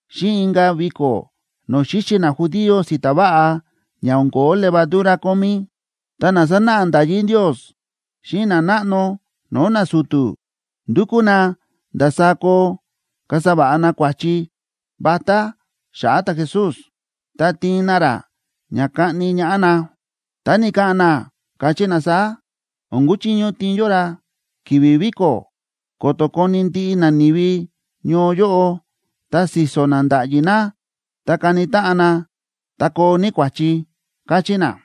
xíꞌin inka̱ viko̱ no̱o̱ xíxi najudío si̱ta̱ váꞌa ña o̱n ko̱ó levadura kómí. Ta na sánáꞌa nda̱yí Ndios xíꞌin nanáꞌno no̱o̱ nasu̱tu̱ ndúkú na ndasaá koo kasa va̱ꞌa na kua̱chi vatá xa̱ꞌa̱ ta̱Jesús, ta tiin na ra ña kaꞌni ñaꞌá na. Ta ni̱ka̱ꞌa̱n na, káchí na saá: ―O̱n kuchiño tiin yó ra ki̱vi̱ viko̱, ko̱to̱ koni ndiꞌi nani̱vi ñoo yóꞌo, ta si̱so̱ na nda̱ꞌyi na, ta kani táꞌan na, ta koo ní kua̱chi ―káchí na.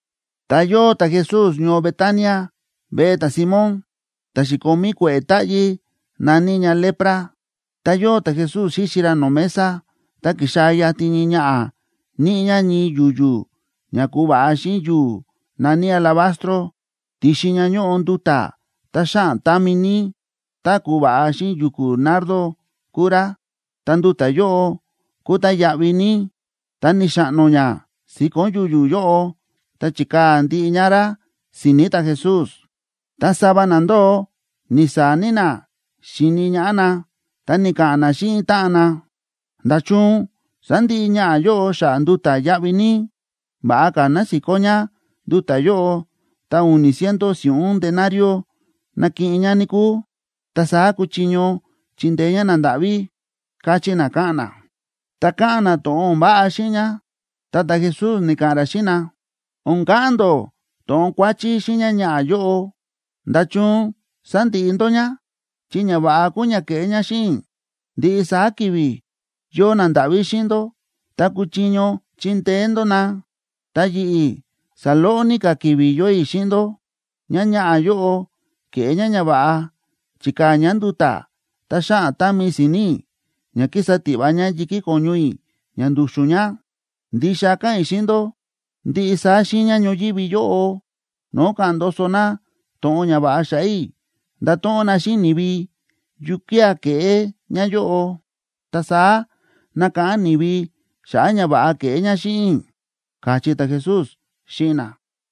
Ta yóo ta̱Jesús ñoo Betania veꞌe ta̱Simón, ta̱ xi̱komí kue̱ꞌe̱ táꞌyí na̱ní ña lepra. Tá yóo ta̱Jesús xíxi ra no̱o̱ mesa, ta ki̱xaa̱ yatin ñii ñaꞌa̱ níꞌi ñá ñii yu̱yu̱ ña ku̱va̱ꞌa xíꞌin yu̱u̱ na̱ní alabastro, ti̱xin ña ñóꞌo nduta̱ tá xáꞌan támi ní, tá ku̱va̱ꞌa xíꞌin yu̱ku̱ nardo kúu rá, ta nduta̱ yóꞌo kúu tá yáꞌví ní. Ta ni̱xaꞌno ñá si̱ko̱n yu̱yu̱ yóꞌo ta chi̱kaa̱ ndiꞌi ñá rá si̱ni̱ ta̱Jesús. Ta sava na ndóo ni̱saa̱ ní na xíni ñaꞌá na, ta ni̱ka̱ꞌa̱n na xíꞌin táꞌan na: ―¿Nda̱chun sa̱ndiꞌi ñaꞌa̱ yóꞌo xa̱ꞌa̱ nduta̱ yáꞌví ní? Va̱ꞌa ka̱ ná si̱kó ñá nduta̱ yóꞌo ta u̱ni̱ ciento si̱ꞌún denariob nakiꞌin ñá, níkúu, ta saá kuchiño chindeé ñá nandáꞌví ―káchí na, káꞌa̱n na. Ta káꞌa̱n na to̱ꞌon o̱n váꞌa xíꞌin ñá. Ta ta̱Jesús ni̱ka̱ꞌa̱n ra xíꞌin na: ―O̱n ka̱ꞌa̱n ndó to̱ꞌon kuáchí xíꞌin ñáñaꞌa̱ yóꞌo. ¿Nda̱chun sándiꞌi ndó ñá? Chi ñava̱ꞌa kúu ña ke̱ꞌé ñá xíꞌin i̱. Ndiꞌi saá ki̱vi̱ yóo nandáꞌví xíꞌin ndó ta kúchiño chindeé ndó na. Ta yi̱ꞌi̱, saloꞌo ní ka̱ ki̱vi̱ yóo i̱ xíꞌin ndó. Ñáñaꞌa̱ yóꞌo ke̱ꞌé ñá ñava̱ꞌa, chi̱kaa̱ ñá nduta̱ tá xáꞌan támi si̱ni̱ i̱ ña ki̱sa tiꞌva ñá yi̱kí ko̱ñu i̱ ña ndu̱xu̱n ña. Ndixa káꞌa̱n i̱ xíꞌin ndó, ndiꞌi saá xiiña ñoyívi yóꞌo no̱o̱ ka̱ꞌa̱n ndoso na to̱ꞌon ñava̱ꞌa xa̱ꞌa̱ i̱, ndato̱ꞌon na xíꞌin ni̱vi yukía̱ ke̱ꞌé ñáyóꞌo. Ta saá nakáꞌán ni̱vi xa̱ꞌa̱ ñava̱ꞌa ke̱ꞌé ñá xíꞌin i̱ ―káchí ta̱Jesús xíꞌin na.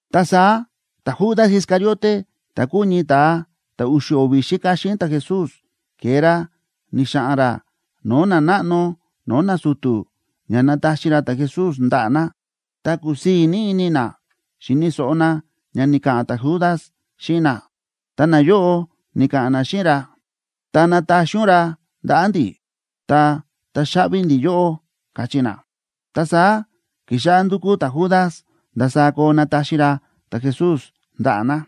Ta saá ta̱Judas Iscariote, ta̱ kúu ñii ta̱a ta̱ u̱xu̱ o̱vi̱ xíka xíꞌin ta̱Jesús, ke̱e ra ni̱xa̱ꞌa̱n ra no̱o̱ nanáꞌno no̱o̱ nasu̱tu̱ ña nataxi ra ta̱Jesús ndaꞌa̱ na. Ta ku̱sii̱ ní ini na xi̱ni̱ so̱ꞌo na ña ni̱ka̱ꞌa̱n ta̱Judas xíꞌin na, ta nayóꞌo ni̱ka̱ꞌa̱n na xíꞌin ra: ―Tá nataxi ún ra ndaꞌa̱ ndi̱, ta taxaꞌvi ndi̱ yóꞌó ―káchí na. Ta saá ki̱xáꞌá ndúkú ta̱Judas ndasaá koo nataxi ra ta̱Jesús ndaꞌa̱ na.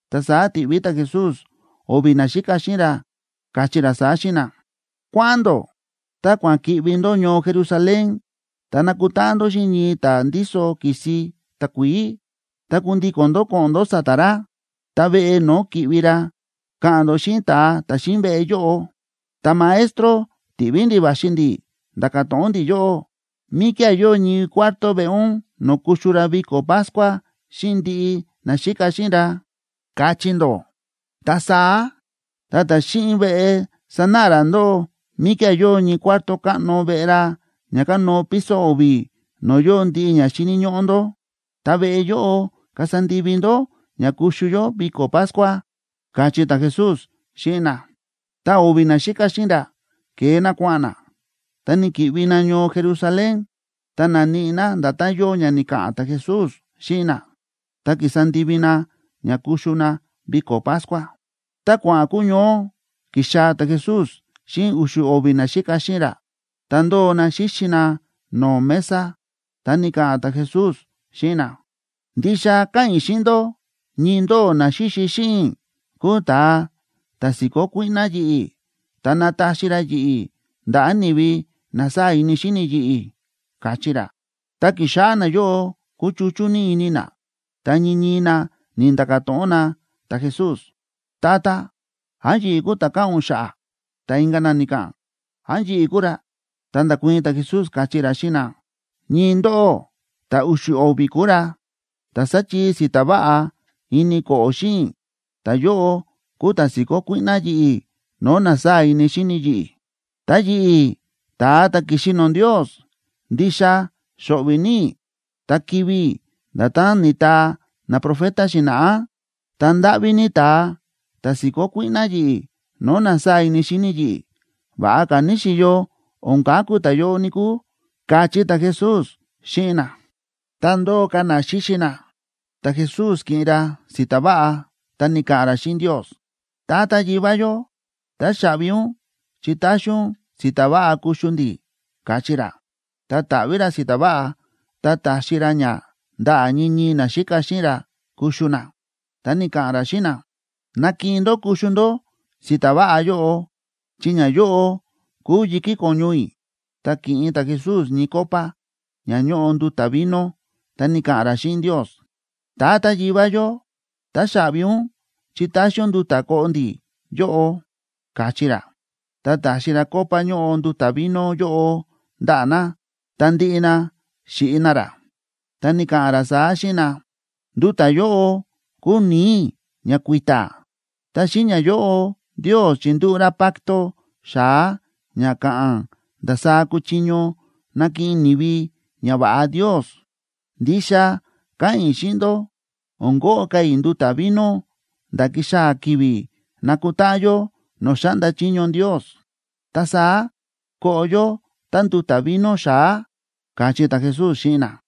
Ta saá ti̱ꞌví ta̱Jesús o̱vi̱ naxíka xíꞌin ra, káchí ra saá xíꞌin na: ―Kua̱ꞌa̱n ndó, ta kua̱ꞌa̱n ki̱ꞌvi ndó ñoo Jerusalén, ta nakutáꞌan ndó xíꞌin ñii ta̱a ndíso ki̱si takuií, ta kundíko̱n ndó ko̱ꞌo̱n ndó sa̱ta̱ ra, ta veꞌe no̱o̱ ki̱ꞌvi ra, ka̱ꞌa̱n ndó xíꞌin ta̱a ta̱ xíꞌin veꞌe yóꞌo: “Ta̱Maestro ti̱ꞌví ndi̱ꞌi̱ va̱xi ndi̱ nda̱ka̱ to̱ꞌon ndi̱ yóꞌó: ¿Míkía̱ yóo ñii cuarto veꞌe ún no̱o̱ kuxu ra viko̱ Pascua xíꞌin ndi̱ꞌi̱, naxíka xíꞌin ra?”, kachí ndó. Ta saá ta̱a ta̱ xíꞌin veꞌe sanáꞌa ra ndóꞌó míkía̱ yóo ñii cuarto káꞌno veꞌe ra ña kánóo piso o̱vi̱, no̱o̱ yóo ndiꞌi ña xíni̱ ñóꞌó ndó. Ta veꞌe yóꞌo kasa ndivi ndó ña kuxu yó viko̱ Pascua ―káchí ta̱Jesús xíꞌin na. Ta o̱vi̱ naxíka xíꞌin ra ke̱e na kua̱ꞌa̱n na, ta ni̱ki̱ꞌvi na ñoo Jerusalén, ta na̱níꞌi na nda̱tán yóo ña ni̱ka̱ꞌa̱n ta̱Jesús xíꞌin na, ta ki̱sa ndivi na ña kuxu na viko̱ Pascua. Tá kua̱ꞌa̱n kuñoó, ki̱xaa̱ ta̱Jesús xíꞌin u̱xu̱ o̱vi̱ naxíka xíꞌin ra. Ta ndóo na xíxi na no̱o̱ mesa, ta ni̱ka̱ꞌa̱n ta̱Jesús xíꞌin na: ―Ndixa káꞌa̱n i̱ xíꞌin ndó, ñii ndóꞌó na xíxi xíꞌin i̱ kúu ta̱a ta̱ si̱kó kuíꞌná yi̱ꞌi̱, ta nataxi ra yi̱ꞌi̱ ndaꞌa̱ ni̱vi na sáa̱ ini xíni yi̱ꞌi̱ ―káchí ra. Ta ki̱xáꞌá nayóꞌo kúchuchú ní ini na, ta ñii ñii na ni̱nda̱ka̱ to̱ꞌon na ta̱Jesús: ―Tata, ¿án yi̱ꞌi̱ kúu ta̱ káꞌa̱n ún xa̱ꞌa̱? Ta inka̱ na ni̱ka̱ꞌa̱n: ―¿Án yi̱ꞌi̱ kúu ra? Ta nda̱kuii̱n ta̱Jesús, káchí ra xíꞌin na: ―Ñii ndóꞌó ta̱ u̱xu̱ o̱vi̱ kúu ra, ta̱ sáchii si̱ta̱ váꞌa ini ko̱ꞌo̱ xíꞌin i̱, ta̱yóꞌo kúu ta̱ si̱kó kuíꞌná yi̱ꞌi̱ no̱o̱ na sáa̱ ini xíni yi̱ꞌi̱. Ta yi̱ꞌi̱, ta̱a ta̱ ki̱xi no̱o̱ Ndios, ndixa xo̱ꞌvi̱ ní i̱ ta kivi̱ i̱, nda̱tán ni̱taa naprofeta xi̱na̱ꞌá. Ta, ¡ndáꞌví ní ta̱a ta̱ si̱kó kuíꞌná yi̱ꞌi̱ no̱o̱ na sáa̱ ini xíni yi̱ꞌi̱! Va̱ꞌa ka̱ níxi̱yo o̱n kaku ta̱yóꞌo, níkúu ―káchí ta̱Jesús xíꞌin na. Tá ndóo ka̱ na xíxi na, ta̱Jesús ki̱ꞌin ra si̱ta̱ váꞌa, ta ni̱ka̱ꞌa̱n ra xíꞌin Ndios: ―Tata Yivá yó, táxaꞌvi ún chi ta̱xi ún si̱ta̱ váꞌa kuxu ndi̱ ―káchí ra. Ta ta̱ꞌví ra si̱ta̱ váꞌa, ta ta̱xi ra ña ndaꞌa̱ ñii ñii naxíka xíꞌin ra kuxu na. Ta ni̱ka̱ꞌa̱n ra xíꞌin na: ―Nakiꞌin ndó kuxu ndó si̱ta̱ váꞌa yóꞌo, chi ñayóꞌo kúu yi̱kí ko̱ñu i̱. Ta ki̱ꞌin ta̱Jesús ñii copa ña ñóꞌo nduta̱ vino, ta ni̱ka̱ꞌa̱n ra xíꞌin Ndios: ―Tata Yivá yó, táxaꞌvi ún chi ta̱xi ún nduta̱ koꞌo ndi̱ yóꞌo ―káchí ra. Ta ta̱xi ra copa ñóꞌo nduta̱ vino yóꞌo ndaꞌa̱ na, ta ndiꞌi na xíꞌi na rá, ta ni̱ka̱ꞌa̱n ra saá xíꞌin na: ―Nduta̱ yóꞌo kúu ni̱i̱ i̱ ña kui̱ta̱. Ta xíꞌin ñayóꞌo Ndios chindúꞌu̱ ra pacto xa̱á ña ka̱ꞌa̱n ndasaá kuchiño nakiꞌin ni̱vi ñava̱ꞌa Ndios. Ndixa káꞌa̱n i̱ xíꞌin ndó, o̱n koꞌo ka̱ i̱ nduta̱ vino nda̱ ki̱xaa̱ ki̱vi̱ nakutáꞌan yó no̱o̱ xáꞌnda chiño Ndios. Ta saá koꞌo yó tánduta̱ vino xa̱á ―káchí ta̱Jesús xíꞌin na.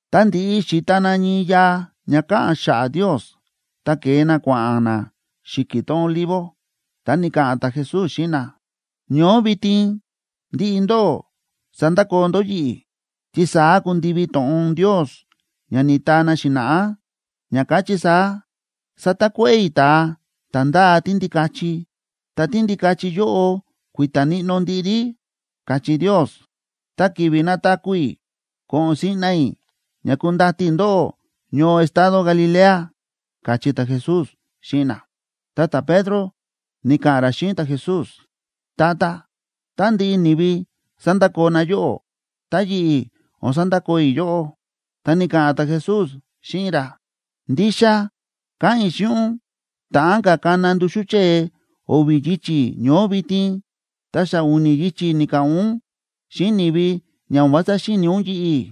Ta ndi̱ꞌi xi̱ta na ñii yaa ña káꞌa̱n xa̱ꞌa̱ Ndios, ta ke̱e na kua̱ꞌa̱n na xi̱ki̱ tón Olivo. Ta ni̱ka̱ꞌa̱n ta̱Jesús xíꞌin na: ―Ñoó vitin ndiꞌi ndóꞌó sandakoo ndó yi̱ꞌi̱, chi saá kundivi to̱ꞌon Ndios ña ni̱taa na xi̱na̱ꞌá, ña káchí saá: “Satakuéꞌe̱ i̱ ta̱a ta̱ ndáa tíndikachi, ta tíndikachi yóꞌo kui̱ta̱ níꞌnó ndiꞌi rí”, káchí Ndios. Ta ki̱vi̱ nataku̱ i̱, ko̱ꞌo̱n siꞌna i̱ ña kundati i̱ ndóꞌó ñoo estado Galilea ―káchí ta̱Jesús xíꞌin na. Ta ta̱Pedro ni̱ka̱ꞌa̱n ra xíꞌin ta̱Jesús: ―Tata, tá ndiꞌi ni̱vi sandakoo na yóꞌó, ta yi̱ꞌi̱ o̱n sandakoo i̱ yóꞌó. Ta ni̱ka̱ꞌa̱n ta̱Jesús xíꞌin ra: ―Ndixa káꞌa̱n i̱ xíꞌin ún, ta̱ꞌán ka̱ kana nduxú chée o̱vi̱ yichi̱ ñoó vitin, ta xa u̱ni̱ yichi̱ ni̱ka̱ꞌa̱n ún xíꞌin ni̱vi ña o̱n vása xíni̱ ún yi̱ꞌi̱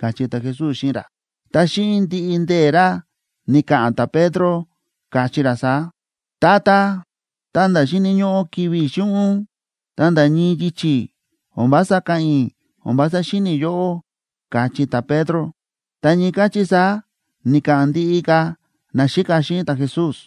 ―káchí ta̱Jesús xíꞌin ra. Ta xíꞌin ndiꞌi ndee̱ ra ni̱ka̱ꞌa̱n ta̱Pedro, káchí ra saá: ―Tata, ta̱nda̱ xíni̱ ñóꞌó kivi̱ i̱ xíꞌin ún, ta nda̱ ñii yichi̱ o̱n vása ka̱ꞌa̱n i̱ o̱n vása xíni̱ i̱ yóꞌó ―káchí ta̱Pedro. Ta ñii káchí saá ni̱ka̱ꞌa̱n ndiꞌi ka̱ naxíka xíꞌin ta̱Jesús.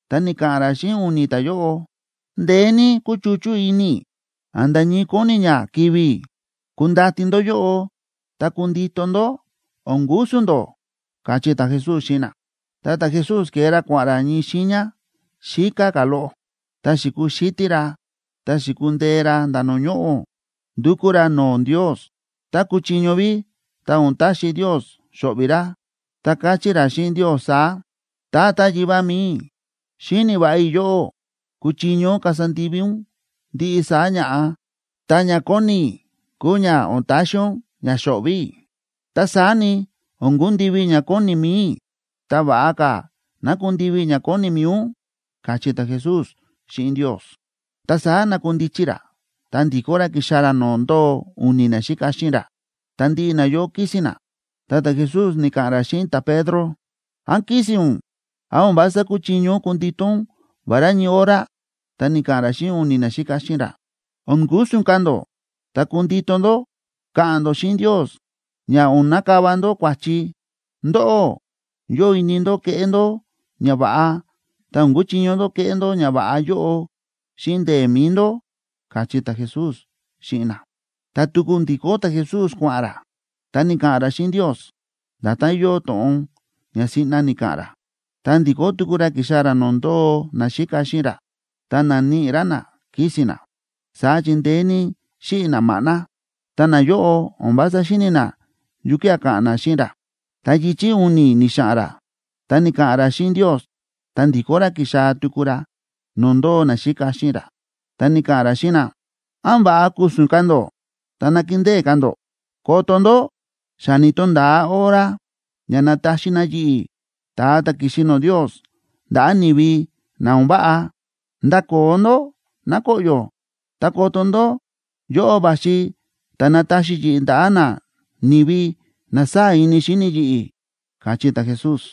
Ta ni̱ka̱ꞌa̱n ra xíꞌin u̱ni̱ ta̱yóꞌo: ―Ndeé ní kúchuchú ini i̱ a̱nda̱ ñii kóni ña kivi̱ i̱. Kundati ndó yóꞌo ta kundito ndó, o̱n ku̱su̱n ndó ―káchí ta̱Jesús xíꞌin na. Ta ta̱Jesús ke̱e ra kua̱ꞌa̱n ra ñii xiiña xíká ka̱ loꞌo, ta xi̱kuxítí ra ta xi̱kundee ra nda̱ no̱o̱ ñoꞌo̱, ndu̱kú ra no̱o̱ Ndios, tá kúchiño ví, ta o̱n taxi Ndios xo̱ꞌvi̱ ra. Ta káchí ra xíꞌin Ndios saá: ―Tata Yivá mi̱i i̱, xíni̱ va̱ꞌa i̱ yóꞌó kúchiño kasa ndivi ún ndiꞌi saá ña̱ꞌa. Ta ña kóni i̱ kúu ña o̱n taxi ún ña xo̱ꞌvi̱ i̱. Ta saá ni, o̱n kundivi ña kóni mi̱i i̱, ta va̱ꞌa ka̱ ná kundivi ña kóni mi̱i ún ―káchí ta̱Jesús xíꞌin Ndios. Ta saá na̱kundichi ra, ta ndi̱kó ra ki̱xaa̱ ra no̱o̱ ndóo u̱ni̱ naxíka xíꞌin ra. Ta ndiꞌi nayóꞌo kísi̱n na. Ta ta̱Jesús ni̱ka̱ꞌa̱n ra xíꞌin ta̱Pedro: ―¿Án kísi̱n ún? ¿Án o̱n vása kúchiño ún kundito ún vará ñii hora? Ta ni̱ka̱ꞌa̱n ra xíꞌin u̱ni̱ naxíka xíꞌin ra: ―O̱n ku̱su̱n ka̱ ndó ta kundito ndó ka̱ꞌa̱n ndó xíꞌin Ndios ña o̱n nakava ndó kua̱chi. Ndóꞌó, yóo ini ndó keꞌé ndó ñava̱ꞌa, ta o̱n kúchiño ndó keꞌé ndó ñava̱ꞌa yóꞌo xíꞌin ndee̱ mi̱i ndó ―káchí ta̱Jesús xíꞌin na. Ta tuku ndi̱kó ta̱Jesús kua̱ꞌa̱n ra, ta ni̱ka̱ꞌa̱n ra xíꞌin Ndios nda̱tán yóo to̱ꞌon ña siꞌna ni̱ka̱ꞌa̱n ra. Ta ndi̱kó tuku ra ki̱xaa̱ ra no̱o̱ ndóo naxíka xíꞌin ra, ta na̱níꞌi ra na kísi̱n na, saá chi ndeé ní xíꞌi̱ na maꞌná. Ta nayóꞌo o̱n vása xíni̱ na yukía̱ ka̱ꞌa̱n na xíꞌin ra. Ta yichi̱ u̱ni̱ ni̱xa̱ꞌa̱n ra ta ni̱ka̱ꞌa̱n ra xíꞌin Ndios, ta ndi̱kó ra ki̱xaa̱ tuku ra no̱o̱ ndóo naxíka xíꞌin ra, ta ni̱ka̱ꞌa̱n ra xíꞌin na: ―¿Án va̱ꞌa ku̱su̱n ka̱ ndó ta nakindée ka̱ ndó? Koto ndó, xa ni̱to̱nda̱a hora ña nataxi na yi̱ꞌi̱, ta̱a ta̱ ki̱xi no̱o̱ Ndios, ndaꞌa̱ ni̱vi na o̱n váꞌa. Ndakoo ndó, ná koꞌyo̱. Ta koto ndó, yóꞌo va̱xi ta̱ nataxi yi̱ꞌi̱ ndaꞌa̱ nani̱vi na sáa̱ ini xíni yi̱ꞌi̱ ―káchí ta̱Jesús.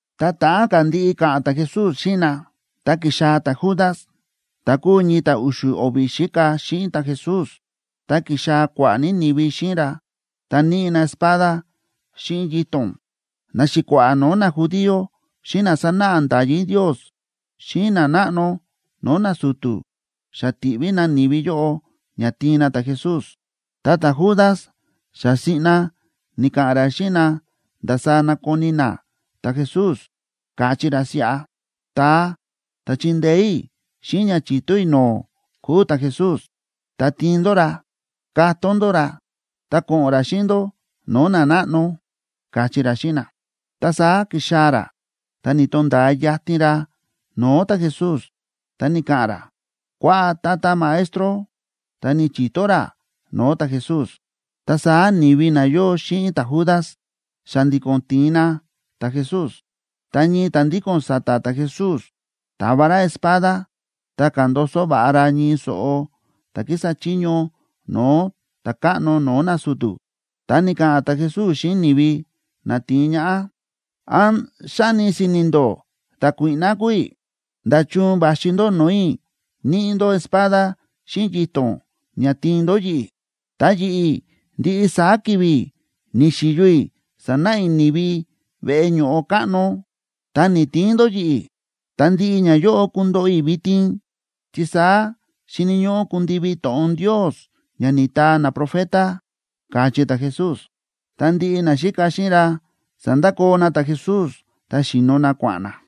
Tá ta̱ꞌán ka̱ ndiꞌi ka̱ꞌa̱n ta̱Jesús xíꞌin na, ta ki̱xaa̱ ta̱Judas ta̱ kúu ñii ta̱ u̱xu̱ o̱vi̱ xíka xíꞌin ta̱Jesús. Ta ki̱xaa̱ kua̱ꞌa̱ ní ni̱vi xíꞌin ra, ta níꞌi na espada xíꞌin yito̱n. Naxi̱kua̱ꞌa̱ no̱o̱ najudío xíꞌin na sánáꞌa nda̱yí Ndios xíꞌin nanáꞌno no̱o̱ nasu̱tu̱ xa ti̱ꞌví na ni̱vi yóꞌo ña tiin na ta̱Jesús. Ta ta̱Judas xa siꞌna ni̱ka̱ꞌa̱n ra xíꞌin na ndasaá nakoni na ta̱Jesús, káchí ra siꞌa: ―Ta̱a ta̱ chindeé i̱ xíꞌin ña chi̱to i̱ no̱o̱ kúu ta̱Jesús. Ta tiin ndó ra katón ndó ra ta ko̱ꞌo̱n ra xíꞌin ndó no̱o̱ nanáꞌno ―káchí ra xíꞌin na. Ta saá ki̱xaa̱ ra, ta ni̱to̱nda̱a yatin ra no̱o̱ ta̱Jesús, ta ni̱ka̱ꞌa̱n ra: ―Kuaꞌa, Tata Maestro. Ta ni̱chi̱to ra no̱o̱ ta̱Jesús. Ta saá ni̱vi na yóo xíꞌin ta̱Judas xa̱ndi̱ko̱n ti̱in na ta̱Jesús. Ta ñii ta̱ ndíko̱n sa̱ta̱ ta̱Jesús ta̱va ra espada, ta ka̱ndoso va̱ꞌa ra ñii so̱ꞌo ta̱ kísa chiño no̱o̱ ta̱káꞌno no̱o̱ nasu̱tu̱. Ta ni̱ka̱ꞌa̱n ta̱Jesús xíꞌin ni̱vi na ti̱in ñaꞌá: ―¿Án xáni si̱ni̱ ndó ta̱kuíꞌná kúu i̱? ¿Nda̱chun va̱xi ndó no̱o̱ i̱ níꞌi ndó espada xíꞌin yito̱n ña tiin ndó yi̱ꞌi̱? Ta yi̱ꞌi̱, ndiꞌi saá ki̱vi̱ ni̱xi̱yo i̱ sánáꞌa i̱ ni̱vi veꞌe ño̱ꞌo káꞌno, ta ni̱‑tiin ndó yi̱ꞌi̱. Ta ndiꞌi ñayóꞌo kundoꞌo i̱ vitin, chi saá xíni̱ ñóꞌó kundivi to̱ꞌon Ndios ña ni̱taa naprofeta ―káchí ta̱Jesús. Ta ndiꞌi naxíka xíꞌin ra sa̱ndakoo na ta̱Jesús, ta xíno na kua̱ꞌa̱n na.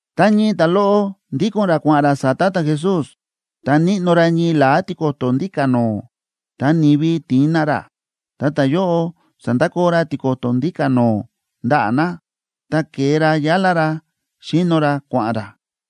Ta ñii ta̱loꞌo ndíko̱n ra kua̱ꞌa̱n ra sa̱ta̱ ta̱Jesús, ta níꞌno ra ñii la̱á tiko̱to̱ ndíka̱ no̱o̱, ta ni̱vi ti̱in na ra, ta ta̱yóꞌo sa̱ndakoo ra tiko̱to̱ ndíka̱ no̱o̱ ndaꞌa̱ na, ta ke̱e ra yálá ra xíno ra kua̱ꞌa̱n ra.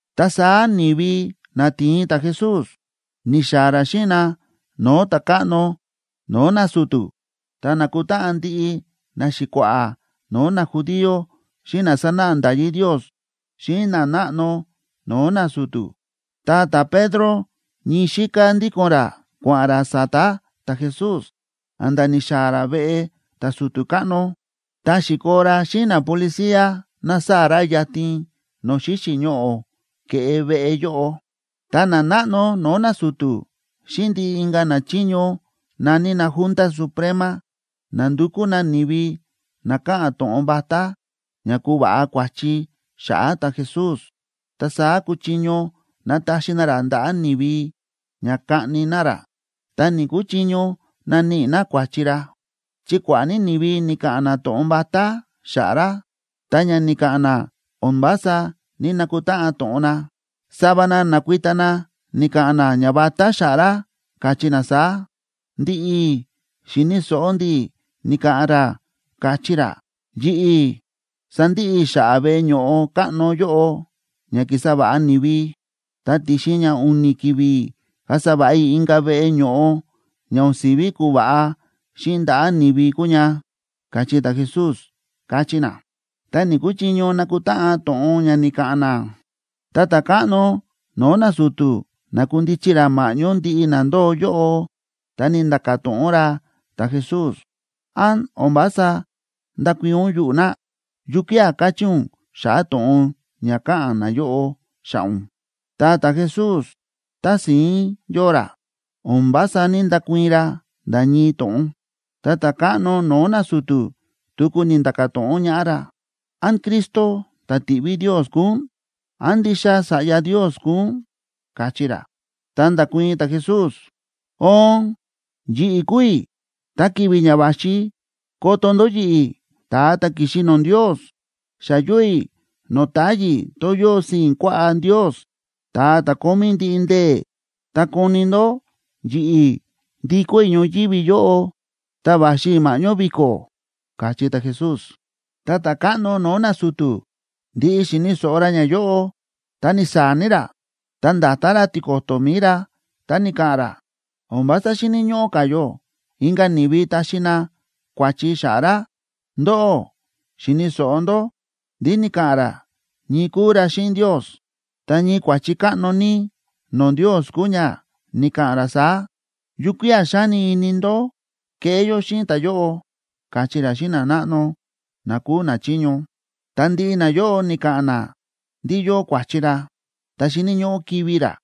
Ta saá ni̱vi na ti̱in ta̱Jesús, ni̱xaa̱ ra xíꞌin na no̱o̱ ta̱káꞌno no̱o̱ nasu̱tu̱. Ta na̱kutáꞌan ndiꞌi naxi̱kua̱ꞌa̱ no̱o̱ najudío xíꞌin na sánáꞌa nda̱yí Ndios xíꞌin nanáꞌno no̱o̱ nasu̱tu̱. Ta ta̱Pedro ñii xíká ndíko̱n ra kua̱ꞌa̱n ra sa̱ta̱ ta̱Jesús a̱nda̱ ni̱xaa̱ ra veꞌe ta̱su̱tu̱ káꞌno. Ta xi̱koo ra xíꞌin napolicía nasaa̱ ra yatin no̱o̱ xíxi̱ ñoꞌo̱ ke̱ꞌe veꞌe yóꞌo. Ta nanáꞌno no̱o̱ nasu̱tu̱ xíꞌin ndiꞌi inka̱ nachiño na̱ní na Junta Suprema nándukú na ni̱vi na ka̱ꞌa̱n to̱ꞌon vatá ña kuva̱ꞌa kua̱chi xa̱ꞌa̱ ta̱Jesús, ta saá kuchiño nataxi na ra ndaꞌa̱ ni̱vi ña kaꞌni na ra, ta ni̱‑kuchiño naníꞌi na kua̱chi ra. Chi kua̱ꞌa̱ ní ni̱vi ni̱ka̱ꞌa̱n na to̱ꞌon vatá xa̱ꞌa̱ ra, ta ña ni̱ka̱ꞌa̱n na o̱n vása ní‑nakutáꞌan to̱ꞌon na. Sava na na̱kuita na ni̱ka̱ꞌa̱n na ñavatá xa̱ꞌa̱ ra, káchí na saá: ―Ndi̱ꞌi̱ xi̱ni̱ so̱ꞌo ndi̱ ni̱ka̱ꞌa̱n ra, káchí ra: “Yi̱ꞌi̱ sandiꞌi i̱ xa̱ꞌa̱ veꞌe ño̱ꞌo káꞌno yóꞌo ña ki̱sa va̱ꞌa ni̱vi, ta ti̱xin ña u̱ni̱ ki̱vi̱ kasa va̱ꞌa i̱ inka̱ veꞌe ño̱ꞌo ña o̱n si̱ví kuva̱ꞌa xíꞌin ndaꞌa̱ ni̱vi kuu ña”, káchí ta̱Jesús ―káchí na. Ta ni̱‑kuchiño nakutáꞌan to̱ꞌon ña ni̱ka̱ꞌa̱n na. Ta ta̱káꞌno no̱o̱ nasu̱tu̱ na̱kundichi ra ma̱ꞌñó ndiꞌi na ndóo yóꞌo, ta ni̱nda̱ka̱ to̱ꞌon ra ta̱Jesús: ―¿Án o̱n vása ndákuii̱n ún yuꞌu̱ na? ¿Yukía̱ kachí ún xa̱ꞌa̱ to̱ꞌon ña káꞌa̱n nayóꞌo xa̱ꞌa̱ ún? Ta ta̱Jesús tási̱ín yóo ra, o̱n vása ní‑ndakuii̱n ra nda̱ ñii to̱ꞌon. Ta ta̱káꞌno no̱o̱ nasu̱tu̱ tuku ni̱nda̱ka̱ to̱ꞌon ñaꞌá ra: ―¿Án Cristo ta̱ ti̱ꞌví Ndios kúu ún? ¿Án ndixa Sa̱ꞌya Ndios kúu ún? ―káchí ra. Ta nda̱kuii̱n ta̱Jesús: ―Oon, yi̱ꞌi̱ kúu i̱. Ta ki̱vi̱ ña va̱xi koto ndó yi̱ꞌi̱, ta̱a ta̱ ki̱xi no̱o̱ Ndios, xa yóo i̱ no̱o̱ táyi̱ tón yóo sii̱n kuaꞌá Ndios, ta̱a ta̱ kómí ndiꞌi ndee̱, ta koni ndó yi̱ꞌi̱ ndikó i̱ ñoyívi yóꞌo, ta va̱xi i̱ ma̱ꞌñó vi̱ko̱ ―káchí ta̱Jesús. Ta ta̱káꞌno no̱o̱ nasu̱tu̱ ndi̱ꞌi xi̱ni̱ so̱ꞌo ra ñayóꞌo, ta ni̱saa̱ ní ra, ta nda̱ta ra tiko̱to̱ mi̱i ra, ta ni̱ka̱ꞌa̱n ra: ―O̱n vása xíni̱ ñóꞌó ka̱ yó inka̱ ni̱vi taxi na kua̱chi xa̱ꞌa̱ ra. Ndóꞌó xi̱ni̱ so̱ꞌo ndó ndí ni̱ka̱ꞌa̱n ra ñii kúu ra xíꞌin Ndios, ta ñii kua̱chi káꞌno ní no̱o̱ Ndios kúu ña ni̱ka̱ꞌa̱n ra saá. ¿Yukía̱ xáni ini ndó keꞌé yó xíꞌin ta̱yóꞌo? ―káchí ra xíꞌin nanáꞌno na kúu nachiño. Ta ndiꞌi nayóꞌo ni̱ka̱ꞌa̱n na ndí yóo kua̱chi ra, ta xíni̱ ñóꞌó kivi̱ ra.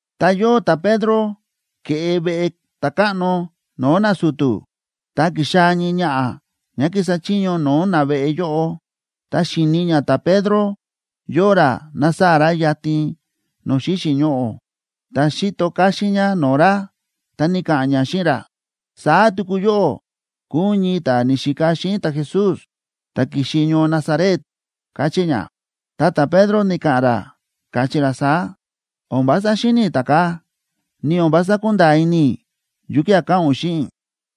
Ta yóo ta̱Pedro ke̱ꞌe veꞌe ta̱káꞌno no̱o̱ nasu̱tu̱, ta ki̱xaa̱ ñii ñaꞌa̱ ñá kísa chiño no̱o̱ naveꞌe yóꞌo. Ta xi̱ni ñá ta̱Pedro yóo ra násaa̱ ra yatin no̱o̱ xíxi̱ ñoꞌo̱, ta xi̱to káxín ñá no̱o̱ ra, ta ni̱ka̱ꞌa̱n ñá xíꞌin ra: ―Saá tuku yóꞌó kúu ún ñii ta̱ ni̱xika xíꞌin ta̱Jesús, ta̱ ki̱xi ñoo Nazaret ―káchí ñá. Ta ta̱Pedro ni̱ka̱ꞌa̱n ra, káchí ra saá: ―O̱n vása xíni̱ i̱ ta̱kaa̱, ni o̱n vása kúnda̱a̱ ini i̱ yukía̱ káꞌa̱n ún xíꞌin i̱.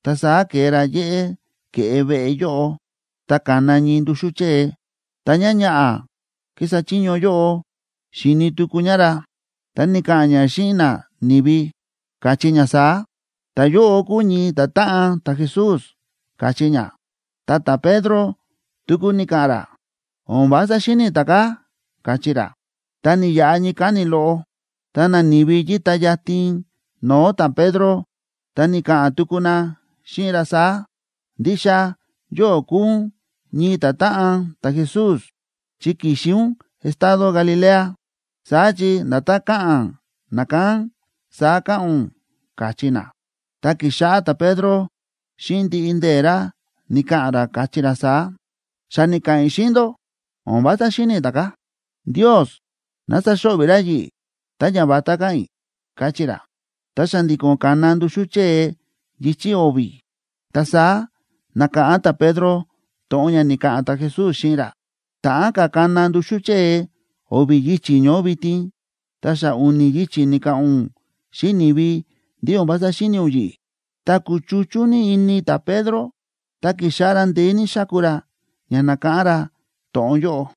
Ta saá ke̱e ra yéꞌé ke̱ꞌe veꞌe yóꞌo. Ta ka̱na ñii nduxú chée. Ta ñáñaꞌa̱ kísa chiño yóꞌo xi̱ni tuku ñá ra, ta ni̱ka̱ꞌa̱n ñá xíꞌin nani̱vi, káchí ña saá: ―Ta̱yóꞌo kúu ñii ta̱táꞌan ta̱Jesús ―káchí ñá. Ta ta̱Pedro tuku ni̱ka̱ꞌa̱n ra: ―O̱n vása xíni̱ i̱ ta̱kaa̱ ―káchí ra. Ta ni̱yaꞌa ñii káni̱ loꞌo, ta nani̱vi yíta yatin no̱o̱ ta̱Pedro, ta ni̱ka̱ꞌa̱n tuku na xíꞌin ra saá: ―Ndixa yóꞌó kúu ún ñii ta̱táꞌan ta̱Jesús, chi ki̱xi ún estado Galilea, saá chi nda̱tán káꞌa̱n nakán saá káꞌa̱n ún ―káchí na. Ta ki̱xáꞌá ta̱Pedro xíꞌin ndiꞌi ndee̱ ra ni̱ka̱ꞌa̱n ra, káchí ra saá: ―Xa ni̱ka̱ꞌa̱n i̱ xíꞌin ndó, o̱n vása xíni̱ i̱ ta̱kaa̱. ¡Ndios ná saxo̱ꞌvi̱ ra yi̱ꞌi̱ tá ñavatá káꞌa̱n i̱! ―káchí ra. Ta xa̱ndi̱ko̱n ka̱na nduxú chée yichi̱ o̱vi̱. Ta saá na̱káꞌán ta̱Pedro to̱ꞌon ña ni̱ka̱ꞌa̱n ta̱Jesús xíꞌin ra: “Ta̱ꞌán ka̱ kana nduxú chée o̱vi̱ yichi̱ ñoó vitin, ta xa u̱ni̱ yichi̱ ni̱ka̱ꞌa̱n ún xíꞌin ni̱vi ndí o̱n vása xíni̱ ún yi̱ꞌi̱.” Ta kúchuchú ní ini ta̱Pedro, ta ki̱xáꞌá ra ndeé ní xáku ra ña nákáꞌán ra to̱ꞌon yóꞌo.